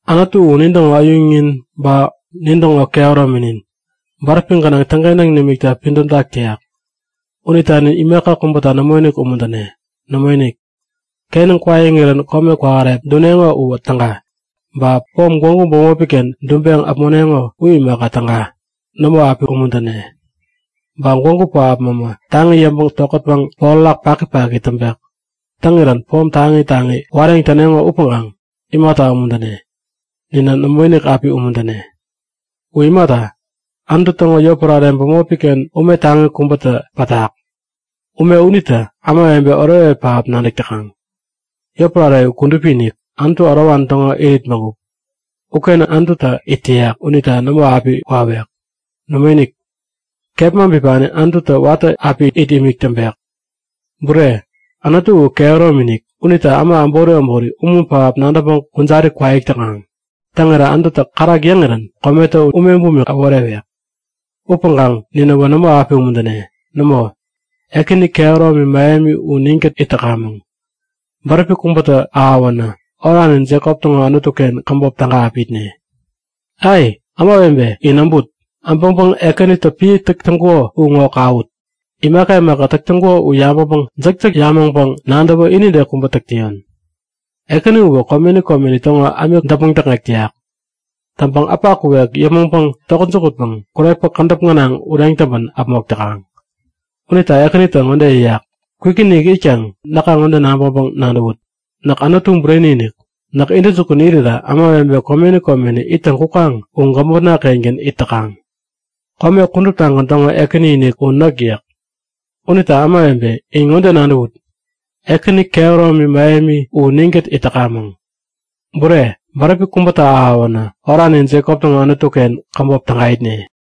Anutu u nintäŋo äyuŋnin ba nintäŋo kehärominin. Bäräpi gänaŋ täŋkentäŋ nimikta pidämtak täyak. Unita nin imaka kubäta nämoinik umuntäne. Nämoinik! Kenäŋ kwaiŋirän kome kwähärep duneŋo uwä täga. Ba pom gwägu bämopiken duŋpeŋ äpmoneŋo u imaka täga. Nämo api umuntäne. Ba gwägu pähap mämä taŋi yäŋpäŋ tokätpäŋ porärak pakipaki täŋpek. Täŋirän pom taŋi taŋi wareŋ täneŋo upäŋkaŋ imata umuntäne? Ninä nämoinik api umuntäne! U imata, Anutu täŋo yotpärare bämopiken ume taŋi kubätä pätak. Ume unita ämawebe oretoret pähap nadäk täkaŋ. Yotpärare u kudupi-inik, Anutu ärowani täŋo irit bägup. Uken Anututä it täyak unita nämo api wawek. Nämoinik, kepma bipani Anututä watä api it imik täŋpek. Bureni, Anutu u kehäromi-inik. Unita äma äbori äbori umun pähap nadäŋpäŋ kujari kwaik täkaŋ. Täŋirä Anututä kärak yäŋirän kometä ume bumik äworewek! Upäŋkaŋ ninäwä nämo api umuntäne. Nämo, Ekäni kehäromi mähemi u ninkät it täkamäŋ. Bäräpi kubätä ahäwänä Oranin Jekop täŋo Anutuken käbop täga api itne. Ai, ämawebe in äbut! Äbäŋpäŋ Ekänitä piä täk täŋkuko u ŋo kawut! Imaka imaka täk täŋkuko u yabäŋpäŋ jäkjäk yamäŋpäŋ nadäwä inide kubä täk täyon! Ekäni uwä komeni komeni täŋo ämik däpmäŋ täkŋek täyak. Täŋpäŋ äpa kuwek yäpmäŋpäŋ tokät jukutpäŋ kurepä kädäp gänaŋ ureŋ täŋpän äpmok täkaŋ. Unita Ekänitä ŋode yäyak; Kwikinik itkaŋ näka ŋode nabäŋpäŋ-nadäwut; Näk Anutu bureni-inik. Näk intäjukun irira ämawebe komeni komeni ittäŋ kukaŋ u gämotna-kengän it täkaŋ. Kome kuduptagän täŋo Ekäni-inik u näk! yäk. Unita ämawebe, in ŋode nadäwut! Ekäni kehäromi mähemi, u ninkät it täkamäŋ. Bureni, bäräpi kubätä ahäwänä Oranin Jekop täŋo Anutuken käbop täga itne.